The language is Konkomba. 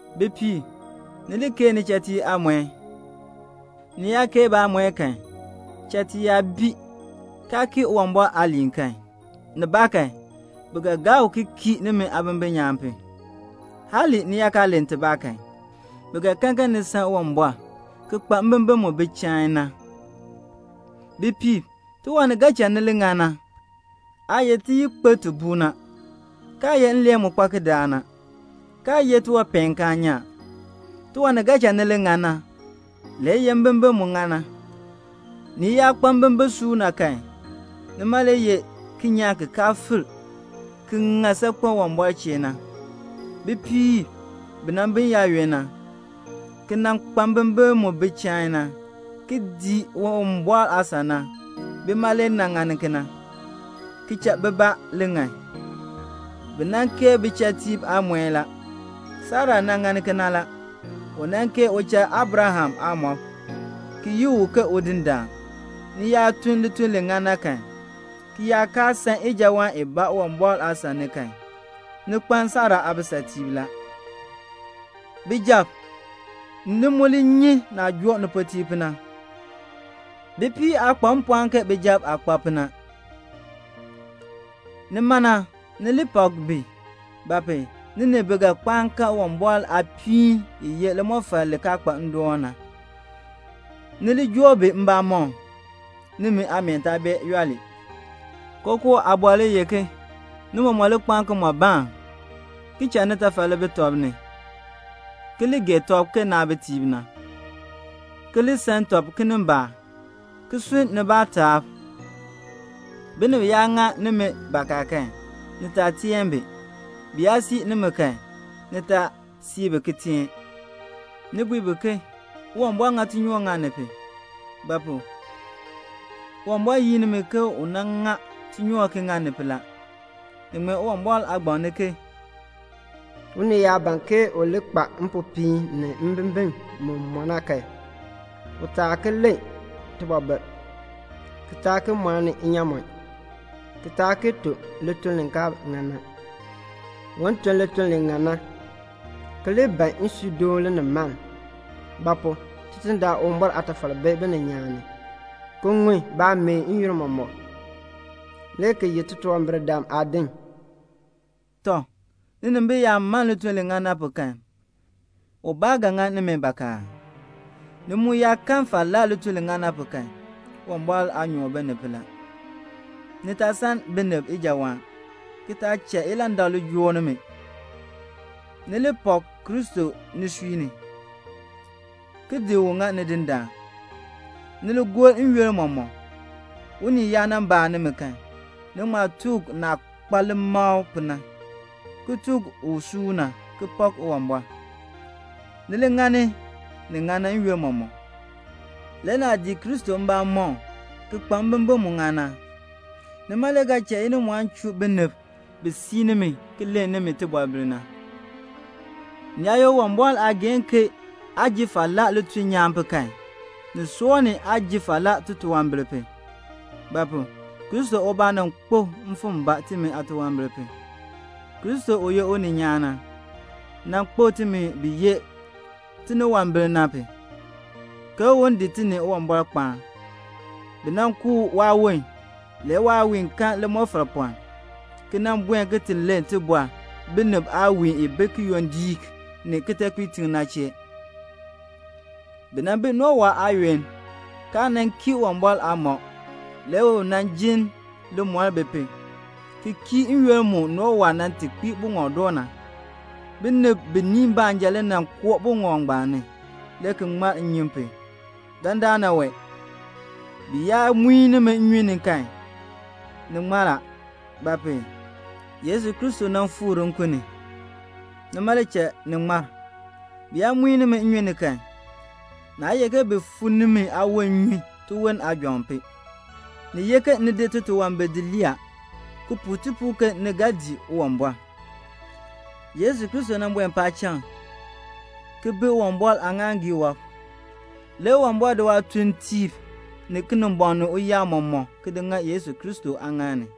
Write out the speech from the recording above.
Bipiib, ni li keei nichatiib aamɔi. Ni yaa keei baamɔi kan, chatiib yaa bi, kaa kii Uwumbɔr aaliin kan, nibaakan bi ga gaa u ki kii nimi aabimbin nyaan pu. Hali ni yaa kaa len tibaa kan, bi ga kan ke ni san Uwumbɔr ki kpa mbimbin mu bi chain na. Bipiib, tiwan ni ga cha ni li ŋan na, aa ye tiyikpir ti buu na, kaa ye nleen mu kpa kidaak na, kaa ye tiwanpeenkaan nyaan. Tiwan ni ga cha ni li ŋan na le ye mbimbin mu ŋan na. Ni yaa kpa mbimbin suuna kan, nima le ye kinyaan ki kaan firk, ki ŋan saakpen Uwumbɔr chee na. Bipiib bi nan bi n-yaayoonn na, ki nan kpa mbimbin mu bi chain na, ki dii Uwumbɔr aasan na, bima le nan ŋani kena, ki cha bibaa li ŋan. Bi nan keei bichatiib aamɔi la. Sara nan ŋani kena la. U nan keei uchal Abraham aamɔb, ki yi u ke udindaan. Ni yaa tun lituln li ŋan na kan, ki yaa kaa san ijawaan ibaa Uwumbɔr aasan ni kan, ni kpaln Sara aabisatiib la. Bijab, ni mu li nyi naah joo nipuutiib pu na. Bipiib aa kpa mpɔɔn ke bijab aah kpa pu na, nima na ni li pak bi; ba pu? ni ni bi ga kpaan kan Uwumbɔr aapiin i ye limɔfal li kaa kpa ndoon na. Ni li joo bi mbamɔm, nimi aameen taa ŋa yooli. Kookoo aabɔr le ye ke ni mɔmɔk li kpaan kimɔbaan, ki cha nitafal li bi tɔb ni, ki li gee tɔb ke naabitiib na, ki li san tɔb kinimbaak, ki sunn nibaa taab. Binib yaa ŋa nimi bakaa kan, ni taa teen bi. Bi yaa sii nimi kan, ni taa sii bi ki teen. Ni bui bi ke "Uwumbɔr ŋa tinyoor ŋa ni pu;" ba pu? Uwumbɔr yin nimi ke un ŋa tinyoor ki ŋa ni pu la. Ni ŋmee Uwumbɔr aagbaŋ ni ke "Unii yaa ban ke u li kpa mpopiin ni mbimbin mu mɔ na kan, u taa ki len tibɔbil, ki taa ki mɔni inyaamɔn, ki taa ki tun lituln li kaa ŋan na; un tun lituln li ŋan na, ki li ban nsuudoon linimaln; ba pu? Tidindaan Uwumbɔr aatafal bi bininyaan ni, ki ŋun baameen n-yoonn mɔmɔk, le ki ye titunwambirdam aadin la." Tɔ, ninimbil yaa man lituln li ŋan na pu kan, ubaa ga ŋa nimi bakaa aa? Ni mu yaa kan falaa lituln li ŋan na pu kan, Uwumbɔr aanyoor bi ni pu la. Ni taa san binib ijawaan, ki taa cha ilandak li joo nimi. Ni li pak Kristo nisui ni, ki di u ŋa Nidindaan. Ni li gor n-yoonn mɔmɔk, unii yaa nan baa nimi kan, ni ŋma tuk u naah kpa limakl pu na. Ni tuk u suuna, ki pak Uwumbɔr. Ni li ŋani ni ŋan na n-yoonn mɔmɔk. Le naah dii Kristo mbamɔm ki kpa mbimbin mu ŋan na, nima le ga cha inimɔɔn chuu binib bi sii nimi ki len nimi tibɔbil na. Ni yaa ye Uwumbɔr aageehn ke aa ji falaa lituln nyaan pu kan, ni soor ni aa ji falaa titunwambir pu. Ba pu? Kristo ubaa nan kpo mfim mbaa timi aatunwambir pu. Kristo u ye uninyaan na, nan kpo timi bi ye tiniwambir na pu, ke un kpaan ti ni Uwumbɔr. Bi nan ku waawon, waawiin kan limɔfapɔln la, ki nan buen ki ti len tibɔr binib aawiin i bi kiyondiik ni kitekpiitiŋ ni na chee. Bi nan bi Nowa aayoonn, kaa nan kii Uwumbɔr aamɔb, le u nan jin limɔr bi pu, ki kii n-yoonn mu Nowa nan ti kpii buŋɔb doo na. Binib biniin baanja le nan koo buŋɔb ngbaan ni, le ki ŋmar nnyun pu. Dandana wee, bi yaa muin nimi nnyun ni kan, ni ŋmar a; ba pu? Yesu Kristo nan fikr nkun ni. Nima le cha ni ŋmar. Bi yaa muin nimi nnyun ni kan, naa ye ke bi fu nimi aawon nnyun tiwon aajɔŋ pu. Ni ye ke ni di titunwambir di lii a, ki puu tipuul ke ni ga dii Uwumbɔr. Yesu Kristo nan buen paacham ki bi Uwumbɔr aaŋaaŋgii wɔb. Le Uwumbɔr di waatuuntiib, ni Kinimbɔŋ ni uyaab mɔmɔk ki di ŋa Yesu Kristo aaŋaal ni.